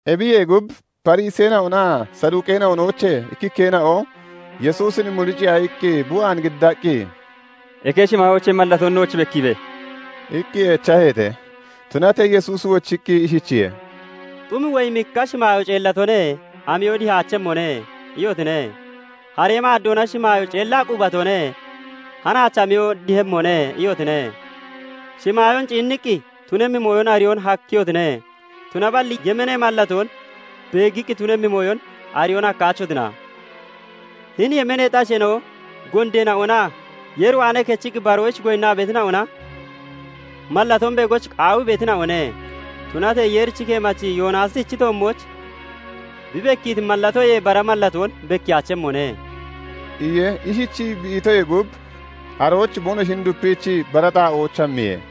Ebiyee gub, Fariseena'onaa Saduuqeena'onoochee ikkikkeena'o Yesuusin muriciiya iqqi bi waan giddaqqi, "Eke shimaayoochee mallatoon nooch bekkiibe!" iqqi echaheete. Tunatee Yesuusi wochiqqi ishichiye:- "Xum woyimikka 'Shimaayoo ceellatone; amiyo dihaachemmone' iyotine; haree maaddoona 'Shimaayoo ceellaa qubatone; hanaach amiyo dihemmone' iyotine. shimaayoon ciinniqqi tunemmi mooyon ariyoon hakkiyotine; tunaballi yemeenee mallatoon beeggiqqi tunemmi mooyon ariyoon hakkaachotina? Hini yemeeneexi asheena'o gondeena'onaa Yeer waanee kechiqqi baroyich goyinnaa beetina'ona mallatoon beegoyich qaawii beetina'one; tunatee Yeeri keemachi Yoonaasichi toommooch bi bekkiiti mallatoyee bara mallatoon bekkiyaachemmone" iye. Ishichii bi itoyee gub arooch boonoshin dupiichii bara xaa'ooch hammiye.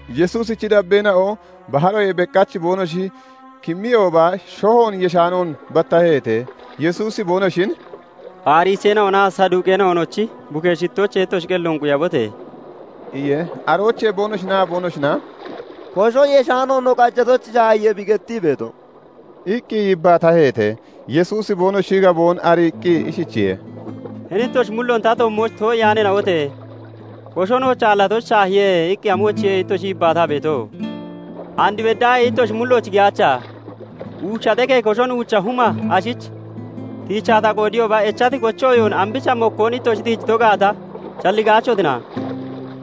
Yesuusichi dabbeena'o baharoyee beqach boonoshi kimmiyooba shohoon yeshaanoon battaheete. Yesuusi boonoshin "Fariseena'onaa Saduuqeena'onochi bukee shittoochee ittoshi qelloon quyabote!" iye. Aroochee boonoshinaa boonoshina "Koshon yeshaano no qajatoyich shaahiye bi gettii beeto" iqqi yibbaataheete. Yesuusi boonoshi gaboon ariiqqi ishichiye:- "Hini ittoshi mulloon ta toommooch too'iyaaneena'ote! 'Kosho nooch aallatoyich shaahiye' iqqi amoyichiye ittoshi yibbaataa beeto? And beddaahee ittoshi mullooch giyaacha? Uucha xekee koshon uucha huma ashich tiichaa ta qoodiyooba, echati kochi ooyoon ambicha mokkoon ittoshi tiijito gaata shalligaachotina?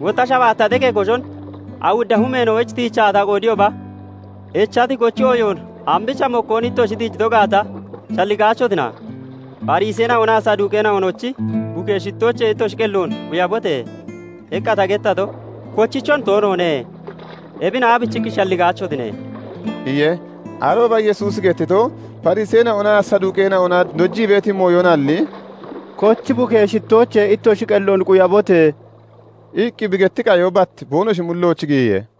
Wotta shabaatta xekee koshon awudda humeena'oyich tiichaa ta qoodiyooba, echati kochi ooyoon ambicha mokkoon ittoshi tiijito gaata shalligaachotina? 'Fariseena'onaa Saduuqeena'onochi bukee shittoochee ittoshi qelloon quyabote!' iqqa ta gettato kochichon toonoone. Ebin aabichiqqi shalligaachotine?" iye. Arooba Yesuusi gettito, Fariseena'onaa Saduuqeena'ona dojii beeti mooyonalli, "Kochi bukee shittoochee ittoshi qelloon quyabote!" iqqi bi getti qayo bat boonoshi mullooch giyiye.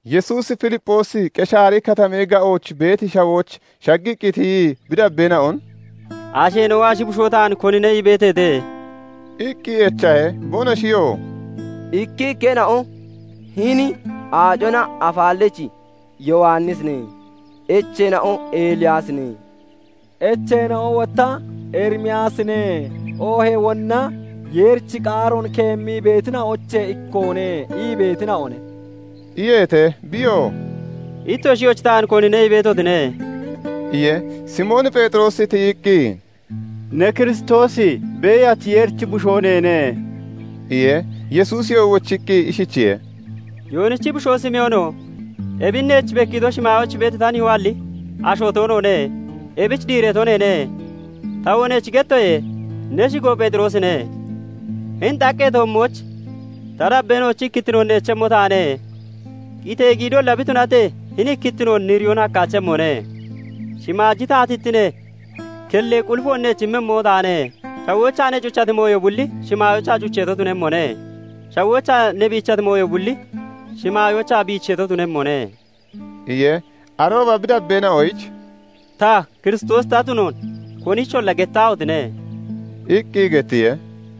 Yesuusi Filipphoosi Qeshaari Kataamee ga'ooch beeti shawooch shaggiqqi tiyii bi dabbeena'on "Asheena'o ashi bushoo taan konine ii beeteete?" iqqi echahe. Boonoshiyoo "Ikkikkeena'o 'Hini Aacona Afaallachi Yowannisine', echeena'o 'Eliyaasine', echeena'o wotta 'Erimiyaasine oohee wonna Yeerichi qaaroon keemmii beetina'oochee ikkoone' ii beetina'one" iyeete. Biyoo "Ittshoyoochi taan konine ii beetotine?" iye. Simoon Pheexiroosi tiyiqqi, "Ne Kiristoosi, beeyachi Yeerichi Bushoo neene" iye. Yesuusiyoo wochiqqi ishichiye:- "Yoonichi bushoo Simoono! Ebin neech bekkiito shimaayooch beeti ta nihoalli asho toonoone; ebichi diireeto neene. Tawoo neech gettoye; ne shigo Pheexiroosine; hini xaqqee toommooch ta dabbeena'ochi ikkittinoon neechemmo taane; qitee giidolla bi tunatee, hini ikkittioon niriyoon hakkaachemmone. shimaaji taatittinee kellee qulifoon neech immemmo taane; shawoochaa ne cuchati mooyo bulli shimaayoochaa cucheeto tunemmone; shawoochaa ne biichati mooyo bulli shimaayoochaa biicheeto tunemmone" iye. Arooba bi dabbeena'oyich "Ta Kiristoosi ta tunoon konicholla gettaahotine!" iqqi gettiye.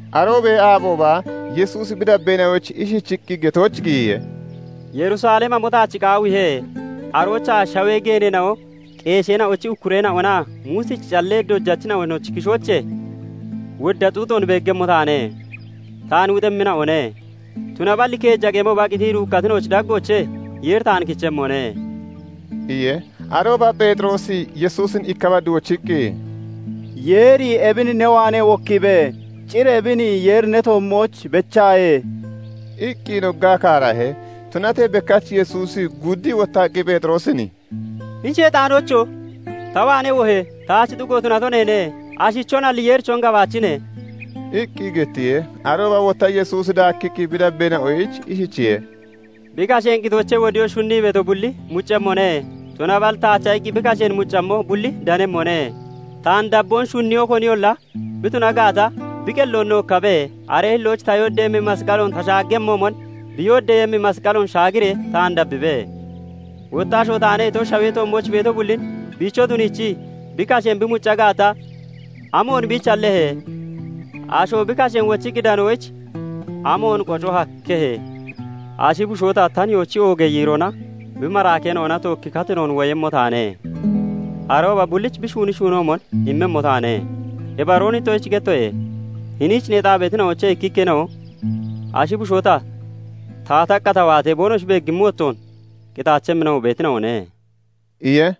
Aroobee aabooba Yesuusi bi dabbeena'oyich ishichiqqi getooch giyiye; "Yerusalem hamo taach qaawiihe; aroochaa shawee geeneena'o, qeesheena'ochi ukkureena'onaa Muusichi callee dojachina'onochi kishoochee wodda xuuxoon beeggemmo taane; taan wuxiiyemmina'one. Tunaballi keeja qemooba qitii duukkatina'ochi daggoochee Yeeri taan kichemmone" iye. Aarooba Pheexiroosi Yesuusin ikka bad wochiqqi, "Yeeri ebin ne waanee wokkiibe; cir ebin Yeeri ne toommooch bechaaye" iqqi noggaa kaarahe. Tunatee bekkach Yesuusi guuddii wottaqqi Pheexiroosin "Hini sheexaanoocho! Ta waanee wohe! Taach xugo tunato neene. Ashichonalli, Yeerichon gabaachine" iqqi gettiye. Arooba wotta Yesuusi daakkiqqi bi dabbeena'oyich ishichiye:- "Bi kasheen qitoochee wodiyoyich shunnii beeto bulli muccemmone; tunaballi taacha iqqi bi kasheen mucammo bulli danemmone. Taan dabboon shunniyo koniyolla bi tuna gaata, bi qelloon nookkabe; aree hillooch ta yooddeeyemmi masqaloon ta shaaggemmoomon, bi yooddeeyemmi masqaloon shaagiree taan dabbibe. Wotta 'Asho taane' ito, shawee toommooch beeto bullin biicho tuniichii bi kasheen bi mucca gaata, amoon biich hallehe? Asho bi kasheen wochiqqi danoyich amoon qoco hakkehe? Ashi bushoo ta, ta nihoochi oogee yiiroona bi maraakeena'ona tookki katinoon woyemmo taane; arooba bullich bi shuuni shuunoomon immemmo taane. Ibaroon ittoshich gettoye; hiniich neexaa beetina'oochee ikkikkeena'o ashi bushoo ta, taataqqa ta waatee boonoshi beegimmi wottoon, qitaachemmina'o beetina'one" iye.